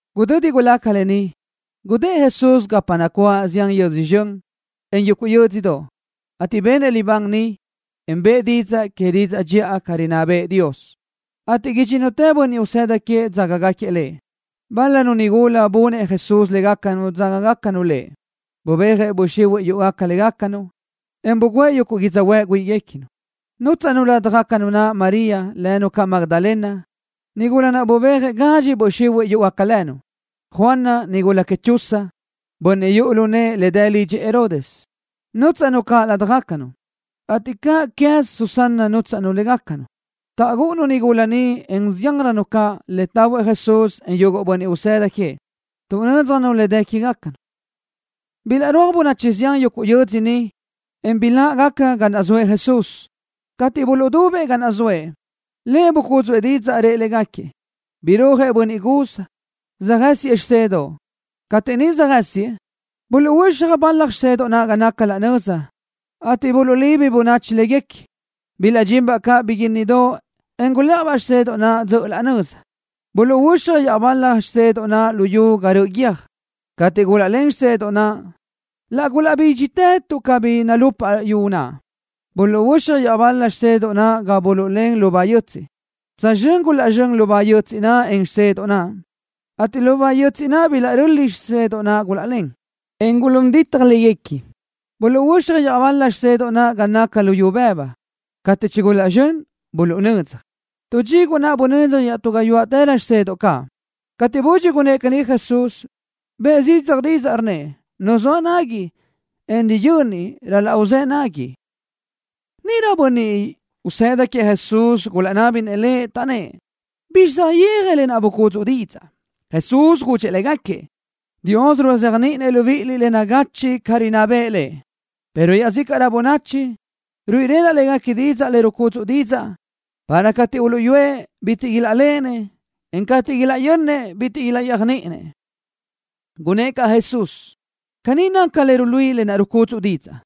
Gudödi gulaca lë ni, gudë́ʼ Jesús gapa nacuáʼ zián yödzö zxön, en yuguʼ yö́dzödoʼ, ateʼ benëʼ libán niʼ, en bëʼë didzaʼ que didzaʼ dxiʼa ca rinná bëʼë Dios, ateʼ idxínnutëʼ bönniʼ usëda queëʼ dzágagaquiëʼ Lëʼ. Bál-lanu nigula bunëʼ Jesús légacanu dzágagacanu caʼ Lëʼ. Bubéajëʼ böʼ xihuiʼ yúʼugaca légacanu, en bugǘëʼ yuguʼ yödzöhuë́ʼ güíʼiguequinu. Nútsaʼnu ládjagacanu María, lënu caʼ Magdalena, nigula naʼ bubéajëʼ gadxi böʼ xihuiʼ yúʼugaca lënu. Juana, nigula queëʼ Chuza, bönniʼ yuʼu lu nëʼë le dë lidxëʼ Herodes, nútsaʼnu caʼ ládjagacanu, ateʼ cáʼanqueze Susana nútsaʼnu caʼ légacanu. Taʼgúʼunu nigula ni, en ziánrönu caʼ, le tahuëʼ Jesús, en yuguʼ bönniʼ usëda queëʼ. Tuʼnö́dzjanu le dë quégacanu. Bilaʼrúaj bönachi zián yuguʼ yödzö niʼ, en biláʼgaca ga naʼ zoëʼ Jesús. Cateʼ buluʼdubëʼ ga naʼ zoëʼ, Lëʼ bucúdzuʼë didzaʼ, rëʼ légaquiëʼ: —Birúajëʼ bönniʼ guz, söjë́siëʼ xisedoʼ. Cateʼ niʼ söjë́siëʼ, buluʼhuöxaj bal-la xisedoʼ naʼ ga naca laʼ nöza, ateʼ buluʼlibi bönachi léguequi. Bilaʼdxinbaʼ caʼ biguínnidoʼ, en gulë́ʼajbaʼ xisedoʼ naʼ dzöʼö laʼ nöza. Buluʼhuöxaj iaʼbal-la xisedoʼ naʼ lu yu ga röʼö guiö́j. Cateʼ gulaʼlén xisedoʼ naʼ, laʼ gulaʼbídxitë tuʼ cabí nalupaʼ yu naʼ. Buluʼhuöxaj iaʼbal-la xisedoʼ naʼ ga buluʼlén lubá yötsiʼ. Tsözxö́n gulaʼzxö́n lubá yötsiʼ naʼ, en xisedoʼ naʼ, ateʼ lubá yötsiʼ naʼ bilaʼröli xisedoʼ naʼ gulaʼlén, en gulún ditaj léguequi. Buluʼhuöxaj iaʼbal-la xisedoʼ naʼ ga naca luyú bëbu. Cateʼ chigulaʼzxö́n, buluʼnödzaj. Tu dxiguʼ naʼ bunödzaj iaʼtú gayuáʼtërö xisedoʼ caʼ. Cateʼ budxi gunnë́ʼ caní Jesús, bëʼë zidzaj didzaʼ, rnnëʼ: —¡Nu zoa nagui, en riyöni ral-laʼ uzë́ nagui! Níʼirö yuguʼ bönniʼ usëda queëʼ Jesús gulaʼnábinëʼ Lëʼ, taʼnnë́ʼ: —¿Bizxi saʼyéaj lë naʼ bucúdzuʼu didzaʼ? Jesús gudxëʼ légaquiëʼ: —Dios ruzéajniʼinëʼ libíʼiliʼ le nagachiʼ ca rinná bëʼë Lëʼ, pero iaʼzícaʼrö bönachi ni, ruíʼilenaʼ léguequi didzaʼ le rucúdzuʼa didzaʼ para cateʼ uluʼyúëʼ, bitiʼ ilaʼléʼenëʼ, en cateʼ ilaʼyönnëʼ, bitiʼ ilaʼyéajniʼinëʼ. Gunnë́ʼ caʼ Jesús: —Caní naca le ruluíʼi lë naʼ bucúdzuʼa didzaʼ.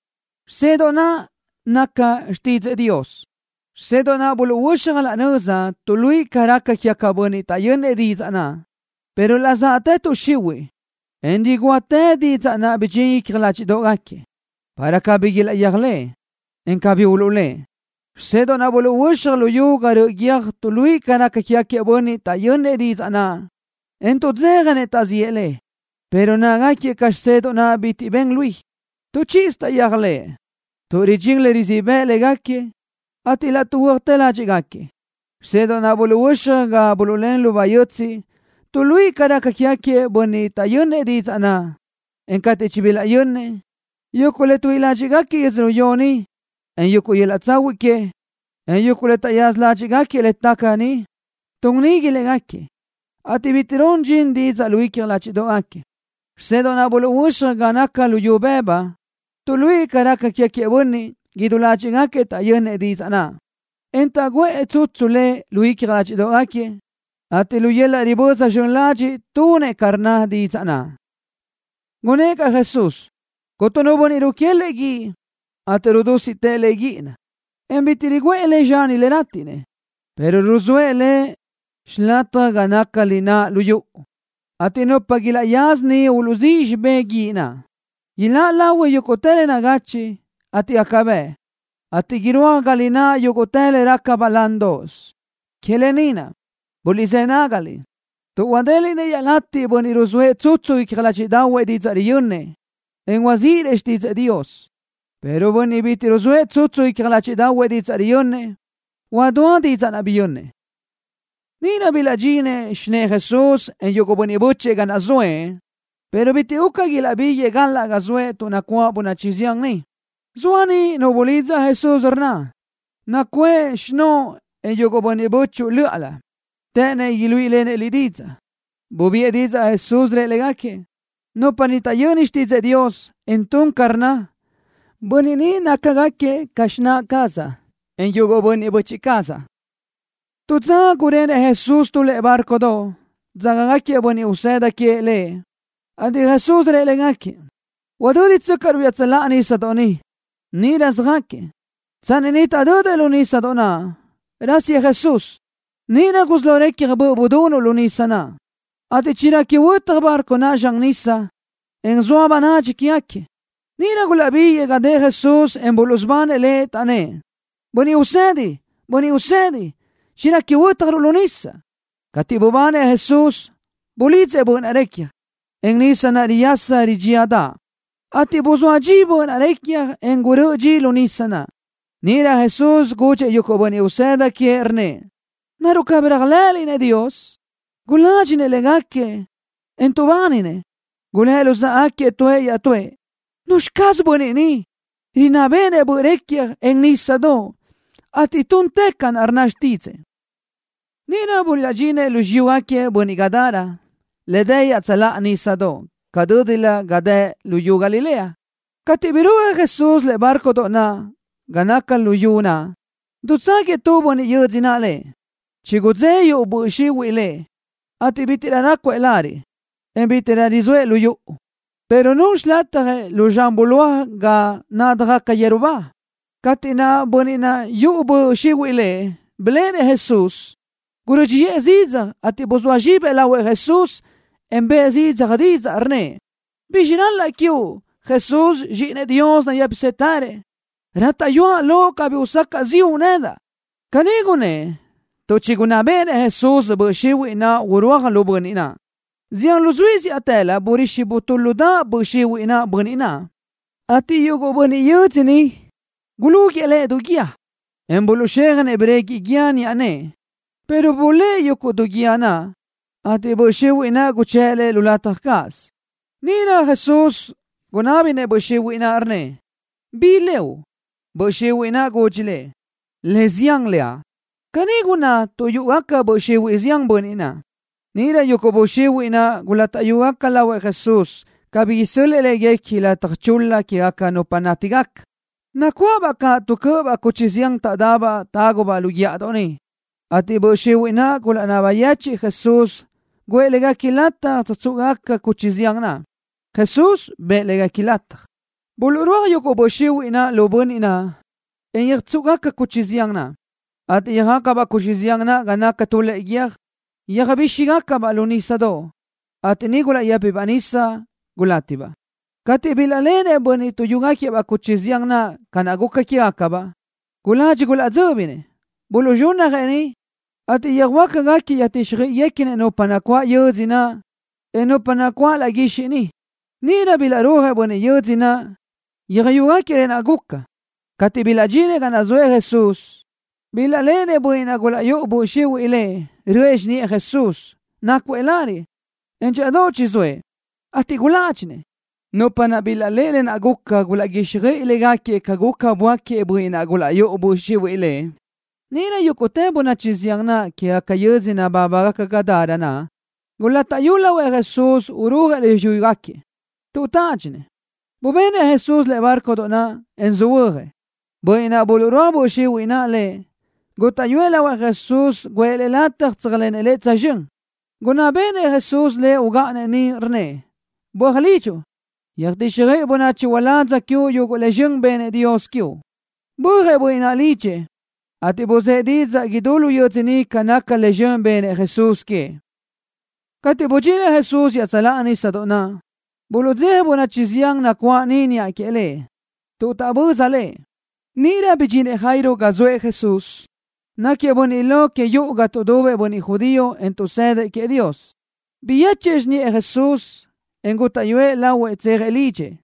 Xisedoʼ naʼ naca xtídzëʼë Dios. Xisedoʼ naʼ buluʼhuöxaj laʼ nöza tuʼluíʼi ca raca quégaca bönniʼ taʼyönnëʼ didzaʼ naʼ, pero laʼ zaʼtë tuʼ xihuiʼ, en rigúa didzaʼ naʼ bidxín lu icja ládxiʼdoʼgaquiëʼ, para cabí ilaʼyéajlëʼë, en cabí uluʼlë́ʼ. Xisedoʼ naʼ buluʼhuöxaj lu yu ga röʼö guiö́j tuʼluíʼi ca raca quégaquiëʼ bönniʼ taʼyönnëʼ didzaʼ naʼ, en tuʼdzéjanëʼ taʼziʼë le, pero nácagaquiëʼ ca xisedoʼ naʼ bitiʼ ben lui. Tu chíʼisö taʼyéajlëʼë, tuʼ ridxín le rizíʼ bëʼ légaquiëʼ, ateʼ laʼ tuʼhuö́atë ládxiʼgaquiëʼ. Xisedoʼ naʼ buluʼhuöxaj ga buluʼlén lubá yötsiʼ tuʼluíʼi ca raca quégaquiëʼ bönniʼ taʼyönnëʼ didzaʼ naʼ, en cateʼ chibilaʼyönnëʼ, yuguʼ le tuíʼi ládxiʼgaquiëʼ yödzölió ni, en yuguʼ yöl-laʼ tsahuiʼ que, en yuguʼ le taʼyaza ládxiʼgaquiëʼ le taca ni, tun nigui légaquiëʼ, ateʼ bitiʼ run dxin didzaʼ naʼ lu icja ládxiʼdoʼgaquiëʼ. Xisedoʼ naʼ buluʼhuöxaj ga naca luyú bëbu tuʼluíʼi ca raca quégaquiëʼ bönniʼ, idú ládxiʼgaquiëʼ taʼyönnëʼ didzaʼ naʼ, en taʼguʼë tsutsu le lu icja ládxiʼdoʼgaquiëʼ, ateʼ lu yöl-laʼ riböza zxön ladxiʼ tunëʼ ca rnna didzaʼ naʼ. Gunnë́ʼ caʼ Jesús: —Cuntu nu bönniʼ ruquélëʼë guíʼ, ateʼ laʼ rudúsiʼtëʼ le guíʼina, en bitiʼ riguʼë le zxani le rátiʼnëʼ, pero ruzóëʼ le xilataj ga naca lináʼ lu yuʼu, ateʼ nupa ilaʼyaza niʼ uluʼzíʼ xibé guíʼ naʼ. Iláʼ lahui yúguʼtë le nagachiʼ, ateʼ gaca bëʼ, ateʼ irúaj ga lináʼ yúguʼtë le raca balándoʼos. ’Que lë ni naʼ, buliʼzë́ nágaliʼ, tuʼ huadéliʼnëʼ iaʼlatiʼ bönniʼ ruzóëʼ tsutsu icja ládxiʼdaʼahuëʼ didzaʼ riyönnëʼ, en huaziʼrëʼ xtídzëʼë Dios, pero bönniʼ bitiʼ ruzóëʼ tsutsu icja ládxiʼdaʼahuëʼ didzaʼ riyönnëʼ, huadúa didzaʼ naʼ biyönnëʼ. Níʼirö bilaʼdxinëʼ xinë́ʼë Jesús, en yuguʼ bönniʼ bö́chëʼë ga naʼ zoëʼ, pero bitiʼ guca ilaʼbíguëʼë galaʼ ga zoëʼ tuʼ nacuáʼ bönachi zián niʼ. Zoa niʼ nu bulidza Jesús, rnna: —Nacuʼë xinóʼo, en yuguʼ bönniʼ bö́chuʼu löʼa. Të́ʼënnëʼ iluíʼilenëʼ Liʼ didzaʼ. Bubiʼë didzaʼ Jesús, rëʼ légaquiëʼ: —Nupa ni taʼyöni xtídzëʼë Dios, en tun ca rnna, bönniʼ ni nácagaquiëʼ ca xináʼ cazaʼ, en yuguʼ bönniʼ böchiʼ cazaʼ. Tu dza gurenëʼ Jesús tu lëʼe bárcodoʼ, dzágagaquiëʼ bönniʼ usëda queëʼ Lëʼ, ateʼ Jesús rëʼ légaquiëʼ: —Udö́ditsöcaʼruʼ iaʼtsöláʼa nísadoʼ ni. Níʼirö söjácatëʼ. Tsanni niʼ taʼdödëʼ lu nísadoʼ naʼ, rásiëʼ Jesús. Níʼirö gusí lo recja böʼ budunuʼ lu nísadoʼ naʼ, ateʼ chirequi huötaj bárcodoʼ naʼ zxan nisa, en zoa bönadxi quégaquiëʼ. Níʼirö gulaʼbiguëʼë ga dëʼ Jesús, en buluʼsubanëʼ Lëʼ, taʼnnë́ʼ: —¡Bönniʼ Usedi! ¡Bönniʼ Usedi! ¡Chirequi huö́tjaruʼ lu nisa! Cateʼ bubanëʼ Jesús, bulidzëʼ böʼ naʼ recja, en nisa naʼ riyasa ridxíadaʼ, ateʼ guzóa dxi böʼ naʼ recja, en gurö́ʼö dxi lu nísadoʼ naʼ. Níʼirö Jesús gudxëʼ yuguʼ bönniʼ usëda queëʼ, rnnëʼ: —¿Naruʼ cabí réajlëʼëliʼ Dios? Guládxinëʼ légaquiëʼ, en tuʼbáninëʼ. Gulë́ luzáʼagaquiëʼ tuëʼ iaʼtúëʼ: —¿Nuzxi caz bönniʼ ni? Rinná béʼenëʼ böʼ recja, en nísadoʼ, ateʼ tun ca rnna xtídzëʼë. Níʼirö bilaʼdxinëʼ lu xiyúgaquiëʼ bönniʼ Gadara, le dë iaʼtsöláʼa nísadoʼ ca dö́dilö ga dë luyú Galilea. Cateʼ birúajëʼ Jesús lëʼe bárcodoʼ naʼ ga naca lu yu naʼ, dutságuiëʼ tu bönniʼ yödzö naʼ Lëʼ. Chigudzé yuʼu böʼ xihuiʼ lëʼ, ateʼ bítiʼrö rácuëʼ lariʼ, en bítiʼrö rizóëʼ lu yuʼu, pero nun xilatjëʼ lu zxan bulóaj ga nádjagaca yeru ba. Cateʼ bönniʼ naʼ yuʼu böʼ xihuiʼ lëʼ biléʼenëʼ Jesús, gurö́dxiʼë zidzaj, ateʼ buzóa zxibëʼ lahuëʼ Jesús, en bëʼë zidzaj didzaʼ, rnnëʼ: —¿Bizxi ral-laʼa quiuʼ, Jesús, Zxíʼinëʼ Dios nayë́pisëtërëʼ? Rátaʼyuaʼ loʼ cabí usacaʼ ziʼu nedaʼ. Caní gunnë́ʼ tuʼ chigunná béʼenëʼ Jesús böʼ xihuiʼ naʼ urúaj lu bönniʼ naʼ. Zián luzuí zíʼatëlö burixi butúludaʼ böʼ xihuiʼ naʼ bönniʼ naʼ, ateʼ yuguʼ bönniʼ yödzö niʼ gulúguiʼë lëʼ du guíë, en buluʼxéjanëʼ breguiʼ guíë niʼa nëʼë, pero blëʼë yuguʼ du guíë naʼ, ateʼ böʼ xihuiʼ naʼ yuʼu lëʼ guchë́ʼ lëʼ lu lataj cáʼasö. Níʼirö Jesús gunábinëʼ böʼ xihuiʼ naʼ, rnnëʼ: —¿Bi leuʼ? Böʼ xihuiʼ naʼ gudxi Lëʼ: —Le Zián leaʼ. Caní gunná tuʼ yúʼugaca böʼ xihuiʼ zián bönniʼ naʼ. Níʼirö yuguʼ böʼ xihuiʼ naʼ gulátaʼyugaca lahuëʼ Jesús cabí isö́l-lëʼë léguequi lataj chul-la quégaca nupa nátigaca. Nacuáʼabaʼ caʼ tu cö́ʼöbaʼ cuchi zián taʼdabaʼ tágubaʼ lu guíʼadoʼ niʼ, ateʼ böʼ xihuiʼ naʼ gulaʼnaba yechiʼ Jesús guʼë léguequi lataj tsöjtsúʼugaca cuchi zián naʼ. Jesús bëʼë léguequi lataj. Buluʼrúaj yuguʼ böʼ xihuiʼ lu bönniʼ naʼ, en yöjtsúʼugaca cuchi zián naʼ, ateʼ yöjácabaʼ cuchi zián naʼ ga naca tu lëʼe guiö́j. Yöjbíxigacabaʼ lu nísadoʼ, ateʼ niʼ gulaʼyë́pibaʼ nisa, gulátibaʼ. Cateʼ bilaʼléʼenëʼ bönniʼ tuʼyúgaquiëʼ-baʼ cuchi zián naʼ ca naʼ guca quégacabaʼ, guladxi gulaʼdzö́binëʼ. Buluʼzxúnnajëʼ niʼ, ateʼ yöjhuö́jgaquiëʼ yöjtíxjöiʼiguequinëʼ nupa nacuáʼ yödzö naʼ, en nupa nacuáʼ laʼ guixiʼ niʼ. Níʼirö bilaʼrúajëʼ bönniʼ yödzö naʼ, yöjyúgaquiëʼ lë naʼ guca. Cateʼ bilaʼdxinëʼ ga naʼ zoëʼ Jesús, bilaʼléʼenëʼ bönniʼ naʼ gulaʼyúʼu böʼ xihuiʼ lëʼ, röʼë xiniʼë Jesús. Nácuëʼ lariʼ, en dxíʼadoʼ chizóëʼ, ateʼ guládxinëʼ. Nupa naʼ bilaʼléʼe lë naʼ guca gulaʼguíxjöiʼi légaquiëʼ ca guca, böáquiëʼ bönniʼ naʼ gulaʼyúʼu böʼ xihuiʼ lëʼ. Níʼirö yúguʼtë bönachi zián naʼ quégaca yödzö nabábagaca Gadara naʼ gulátaʼyu lahuëʼ Jesús urúajëʼ lu xiyúguequi, tuʼ tádxinëʼ. Bubenëʼ Jesús lëʼe bárcodoʼ naʼ, en söhuö́jëʼ. Bönniʼ naʼ buluʼrúaj böʼ xihuiʼ naʼ lëʼ gútaʼyuëʼ lahuëʼ Jesús guʼë lëʼ lataj tséajlenëʼ Lëʼ tsözxö́n. Gunná béʼenëʼ Jesús lëʼ ugáʼanëʼ niʼ, rnnëʼ: —Böaj lidxuʼ. Yöjtíxjöiʼi bönachi uládz quiuʼ yuguʼ le zxön benëʼ Dios quiuʼ. Bö́ajëʼ bönniʼ naʼ lidxëʼ, ateʼ buzë́ʼ didzaʼ idú lu yödzö niʼ ca naca le zxön benëʼ Jesús queëʼ. Cateʼ budxinëʼ Jesús iaʼtsöláʼa nísadoʼ naʼ, buluʼdzeja bönachi zián nacuáʼ niʼ niʼa queëʼ Lëʼ, tuʼ taʼböza Lëʼ. Níʼirö bidxinëʼ Jairo ga zoëʼ Jesús. Náquiëʼ bönniʼ lo que yuʼu ga tuʼdubëʼ bönniʼ judío, en tuʼsëdëʼ queëʼ Dios. Biyéchuëʼ xiniʼë Jesús, en gútaʼyuëʼ lahuëʼ tsejëʼ lidxëʼ.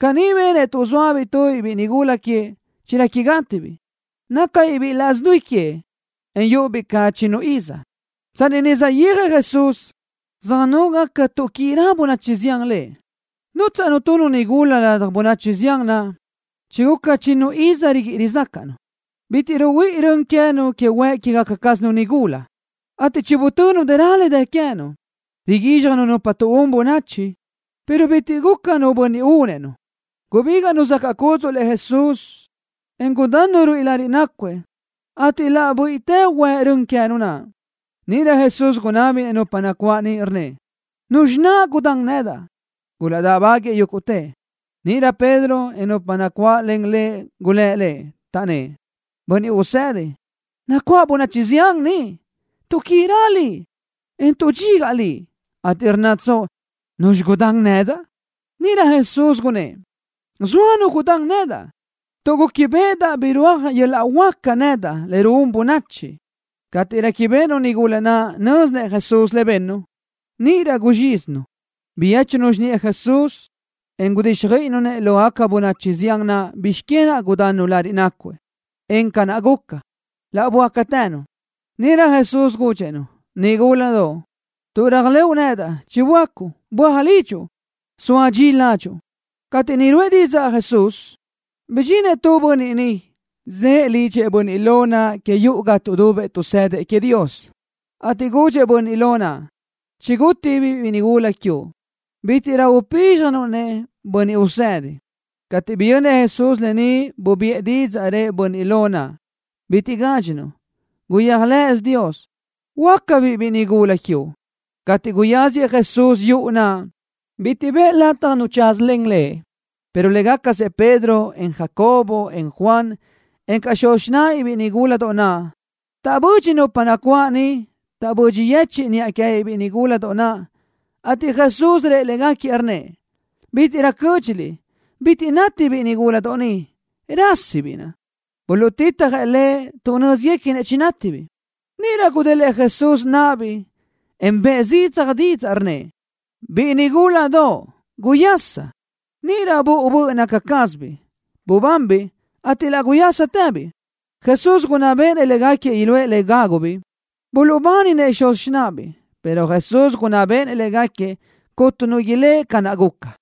Caní benëʼ tuʼ zóabiʼ tubiʼ biʼi nigula queëʼ, chirequi gátibiʼ. Nácabiʼ biʼi laʼs dui queëʼ, en yúʼubiʼ ca chinnu iz. Tsanni niʼ saʼyéajëʼ Jesús, sönógaca tuʼquirö bönachi zián Lëʼ. Nútsaʼnu tu nigula ladaj bönachi zián naʼ, chiguca chinnu iz riguíʼi rizácaʼnu. Bitiʼ ruhuíʼi rön queë́nu que huëʼ quégaca cázanu nigula, ateʼ chibutönu dëra le dë queë́nu, riguízxjanu nupa tuʼún bönachi, pero bitiʼ guca nu bönniʼ únëʼ-nu. Gubígaʼnu zacaʼ cúdzuʼlëʼ Jesús, en gudannu ruíʼi lariʼ nácuëʼ, ateʼ laʼ buíʼitë huëʼ rön queë́nu. Níʼirö Jesús gunábinëʼ nupa nacuáʼ niʼ, rnnëʼ: —¿Nuzxi naʼ gudán nedaʼ? Gulaʼdáʼbaguiʼë yúguʼtëʼ. Níʼirö Pedro, en nupa nacuáʼlen lëʼ gulë́ʼ Lëʼ, taʼnnë́ʼ: —Bönniʼ Usedi, nacuáʼ bönachi zián ni, tuʼquirö Liʼ, en tuʼdxigaʼ Liʼ, ateʼ ¿rnnatsoʼ: “¿Nuzxi naʼ gudán nedaʼ?” Níʼirö Jesús gunnë́ʼ: —Zoa nu gudán nedaʼ, tuʼ gúquibeʼedaʼ birúaj yöl-laʼ huáca nedaʼ le ruún bönachi. Cateʼ réquibeʼenu nigula naʼ nö́zinëʼ Jesús le bennu, níʼirö guzxízinu. Biyéchunu xiniʼë Jesús, en gudíxjöiʼinu Lëʼ lógaca bönachi zián naʼ bizx que naʼ gudannu lariʼ nácuëʼ, en ca naʼ guca, laʼ böácatënu. Níʼirö Jesús gudxëʼ-nu: —Nigúladoʼ, tuʼ réajlëʼu nedaʼ chiböácuʼ. Böaj lidxuʼ, zoa dxi ládxuʼu. Cateʼ niʼ ruʼë Jesús didzaʼ ni, bidxinëʼ tu bönniʼ niʼ, zëʼë lidxëʼ bönniʼ lo naʼ que yuʼu ga tuʼdubëʼ tuʼsëdëʼ queëʼ Dios, ateʼ gudxëʼ bönniʼ lo naʼ: —Chigútibiʼ biʼi nigúladoʼ quiuʼ. Bítiʼrö upízxjanuʼ-nëʼ Bönniʼ Usedi. Cateʼ biyönnëʼ Jesús lë ni, bubiʼë didzaʼ, rëʼ bönniʼ lo naʼ: —Bitiʼ gádxinuʼ. Guyéajlëʼësö Dios. Huöácabiʼ biʼi nigúladoʼ quiuʼ. Cateʼ guyáziëʼ Jesús yuʼu naʼ, bitiʼ bëʼë lataj nu tsázalen Lëʼ, pero légacasëʼ Pedro, en Jacobo, en Juan, encaʼ xuz xináʼabiʼ nigúladoʼ naʼ. Taʼbödxi nupa nacuáʼ niʼ. Taʼbödxi yechë́ʼë niʼa queë́biʼ biʼi nigúladoʼ naʼ, ateʼ Jesús rëʼ légaquiëʼ, rnnëʼ: —Bítiʼrö cö́dxiliʼ. Bitiʼ nátibiʼ nigúladoʼ ni. Rásisibiʼ. Buluʼtitjëʼ Lëʼ tuʼ nö́zguequinëʼ chinátibiʼ. Níʼirö gudélëʼë Jesús náʼabiʼ, en bëʼë zidzaj didzaʼ, rnnëʼ: —Biʼi nigúladoʼ, guyaschi. Níʼirö buʼu böʼ naca cázabiʼ, bubanbiʼ, ateʼ laʼ guyásatëbiʼ. Jesús gunná béʼenëʼ légaquiëʼ iluʼë le gágubiʼ. Buluʼbáninëʼ xuz xináʼabiʼ, pero Jesús gunná béʼenëʼ légaquiëʼ cuntu nu ilë́ʼ ca naʼ guca.